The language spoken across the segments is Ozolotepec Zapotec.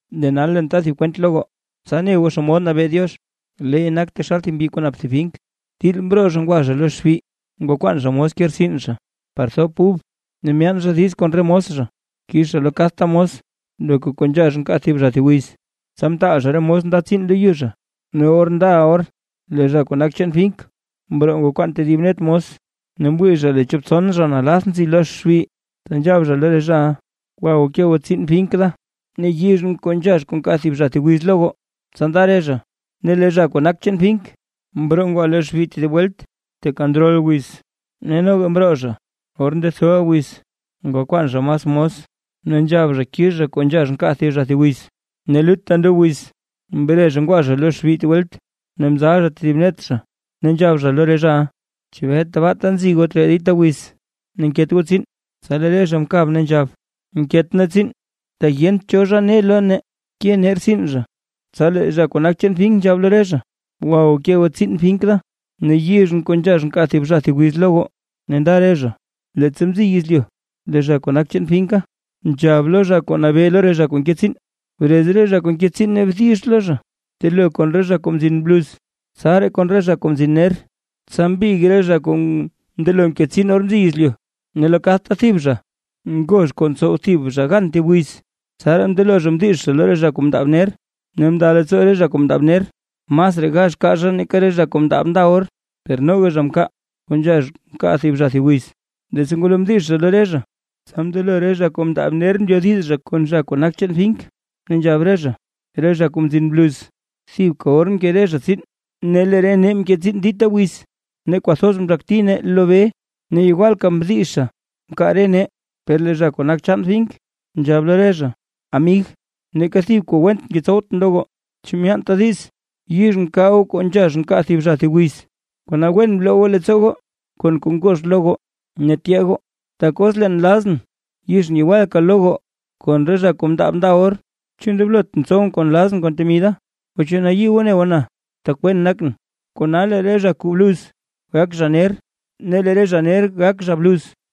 ’Lee nal leen ta thib kwent lo goo, tsa ne goo xomod nabee Diox. Leey nak taxal thib mbyi kuu nap thib fink. Til mroo zha ngwa zha lo xbi ngwakwaan zha mos ke rtsin zha, par thop ub. Ne myaan zha diiz kon re mos zha, kix zha lo kadta mos loka kuu nzhax nkaa thib zha thib wiz. Tsa mtaal zha re mos nda tsiin lo yu zha. Ne or ndaʼa or lee zha kuu nak chaan fink mroo ngwakwaan tedib net mos, ne mwii zha lee chop tson zha nalath nzi lo xbi. Tsa nzhab zha lo re zhaʼa: “Gwa goo ke goo tsiin fink da, ne yizhʼn kuu nzhax nkaa thib zha thib wiz lo goo”. Tsa nda re zha. Ne lee zha kuu nak chaan fink, mroo ngwa lo xbi tedib welt teeka ndrol wiz, ne noga mroo zha, or ndethoʼa wiz ngwakwaan zha mas mos, ne nzhab zha kix zha kuu nzhax nkaa thib zha thib wiz. Ne telutta ndob wiz mre zha ngwa zha lo xbi tedib welt ne mzal zha tedib net zha, ne nzhab zha lo re zhaʼa: “¿Chebee tbaata nzi goo tree dita wiz ne nket goo tsiin?” Tsa lee re zha mkab ne nzhab: “Nket nee tsiin, tak yent cho zha ne lo nee ke nee rtsin zha”. Tsa lee zha kuu nak chaan fink nzhab lo re zha: “Gwa goo ke goo tsiin fink da, ne yizhʼn kuu nzhax nkaa thib zha thib wiz lo goo, ne nda re zha”. ’Leettsa mziy yezlyu, lee zha kuu nak chaan finka, nzhab lo zha kuu nabee lo re zha kuu nke tsiin: “Brez re zha kuu nke tsiin ne bdix lo zha. Btelo kon re zha kuu mzin bluz, tsaraa kon re zha kuu mzin ner.” Tsa mbig re zha kuu mndelo mke tsiin or mziy yezlyu, ne lo kadta thib zha ngozh kuu ntsow thib zha gan thib wiz. Tsaraa mndelo zha mdix zha lo re zha kuu mndaab ner, ne mnda leettsoo re zha kuu mndaab ner, masraa gax kaa zha nake re zha kuu mndaab nda or; per noga zha mkaa kuu nzhax nkaa thib zha thib wiz. Leettsa ngwalo mdix zha lo re zha, tsa mndelo re zha kuu mndaab ner mbyodiz kon zha kuu nak chaan fink. Ne nzhab re zha: “Re zha kuu mzin bluz, thibka or mke zha tsiin; ne lee re nee mke tsiin dita wiz, ne kwathoz mzhakti nee lo bee ne yewalka mdizha mkaa re nee”. Per lee zha kuu nak chaan fink nzhab lo re zha: “Amig, neeka thib kuu went ngetsowtʼn lo goo. ¿Chu myaantaa diiz yizhʼn kaa goo kuu nzhax nkaa thib zha thib wiz? Kona wen bloo goo leettsoo goo kon kuu ngox lo goo ne tyee goo, tak os leen nlazʼn yizhʼn yewalka lo goo kon re zha kuu mndaab nda or, ¿chu ndoblotʼn tsowʼn kuu nlazʼn kon temi da? ¿O chu nayii goo ne goo na, tak wen nakʼn?” Kona lee re zha kuu bluz gak zha ner, ne lee re zha ner gak zha bluz.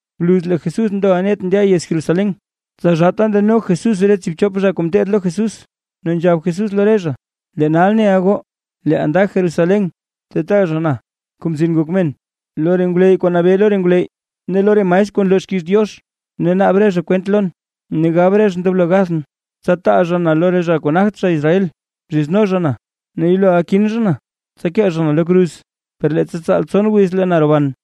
Bluz lee Jesús ndoʼa net ndya yez Jerusalén, tsa zhaata ndano Jesús re tsiibchop zha kuu ngeteed lo Jesús, ne nzhab Jesús lo re zha: ―Lee nal neʼa goo, leeʼaa nda Jerusalén ta taa zha na, Kuu Mzin Ngok Men, lo re ngwleyy kuu nabee lo re ngwleyy ne lo re maestr kuu nloo xkiiz Diox, ne naab re zha kwent lon ne gab re zha ndoblo gathʼn. Tsa taa zha na lo re zha kuu nagt zha Israel, zhizno zha na ne yeloʼa kin zha na, tsa kee zha na lo kruz. Per leettsa tsaal tson wiz lee na roban.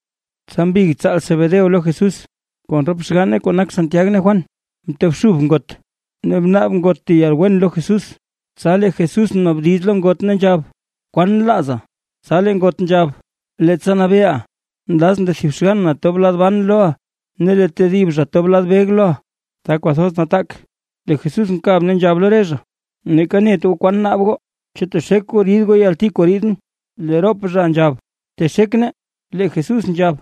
Tsa mbig tsaal Zebedeo lo Jesús, kon rop xganne kuu nak Santiag ne Juan, mtobxub ngot, ne mnaab ngot thib yalwen lo Jesús. Tsa lee Jesús mnaabdiz lo ngot ne nzhab: ―¿Kwan nlaaza? Tsa lee ngot nzhab: ―Leettsa nabeeʼa, nlazʼn lee thib xgann na tob lad ban loʼa lee tedib zha tob lad beg loʼa, ta kwathoz nataak. Lee Jesús mkab ne nzhab lo re zha: ―Neeka net goo naa kwan naab goo. ¿Chu texek goo rid goo yalti kuu riidʼn? Lee rop zha nzhab: ―Texek nee. Lee Jesús nzhab: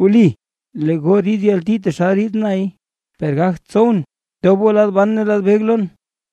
―Wli, lee goo rid yalti taxal rid nay; per gagt tsowʼn tobʼn goo lad ban ne lad beg lon,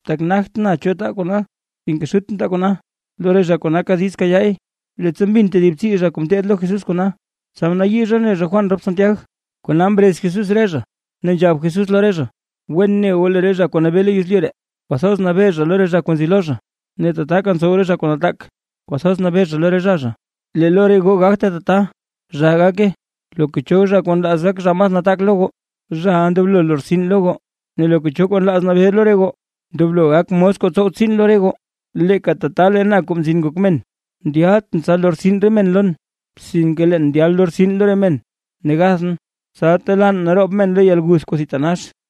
tak nagt na kuu taa kona. Sinke Xutʼn taa kona lo re zha kuu naka diiz kayaay. Leettsa mbin tedib tsii zha kuu ngeteed lo Jesús kona, tsa mnayii zha mne Juan rop Santiag. Kona mrez Jesús re zha, ne nzhab Jesús lo re zha: ―Wen ne goo lee re zha kuu nabee lo yezlyu ree, kwathoz nabee zha lo re zha kuu nzi lo zha, ne tataka ntsow re zha kuu nataak, kwathoz nabee zha lo re zha zha. Lee lo re goo gagte tata, zhaa gake. Loka cho zha kuu nlaaz gak zha kuu mas nataak lo goo, zhaʼa ndoblo lortsin lo goo. Ne loka cho nlaaz nabee lo re goo, ndoblo gak mos kuu tsow tsiin lo re goo. Leeka tata lee na, Kuu Mzin Ngok Men, ndyaltʼn tsa lortsin re men lon, sinke leen ndyal lortsin lo re men, ne gathʼn, tsa telaan naroob men lo yalguth kuu thitanax.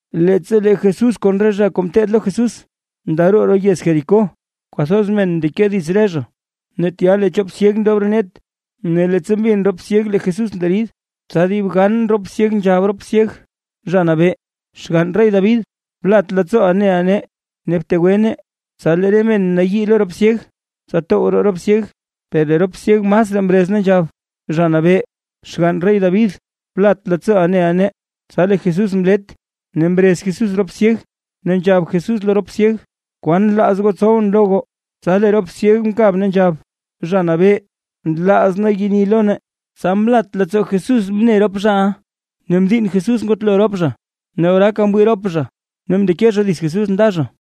Leettsa lee Jesús kon re zha kuu ngeteed lo Jesús ndaroo roo yez Jericó, kwathoz men mndeke dits re zha. Ne tya lee chop syeg ndob roo net; ne leettsa mbin rop syeg lee Jesús nderid, tsa dib gan rop syeg, nzhab rop syeg: ―Zha Nabee, Xgann rey David, blat leettsooʼa neʼa nee ne btegwe nee. Tsa lee re men mnayii lo rop syeg, tsa tow roo rop syeg, per lee rop syeg masraa mrez ne nzhab: ―Zha Nabee, Xgann rey David, blat leettsooʼa neʼa nee. Tsa lee Jesús mlet, ne mrez Jesús rop syeg, ne nzhab Jesús lo rop syeg: ―¿Kwan nlaaz goo tsowʼn lo goo? Tsa lee rop syeg mkab ne nzhab: ―Zha Nabee, nlaaz nee yeni lo nee. Tsa mlat leettsoo Jesús mne rop zhaʼa, ne mdiinn Jesús ngutlo rop zha. Ne oraaka mwii rop zha, ne mndeke zha dits Jesús nda zha.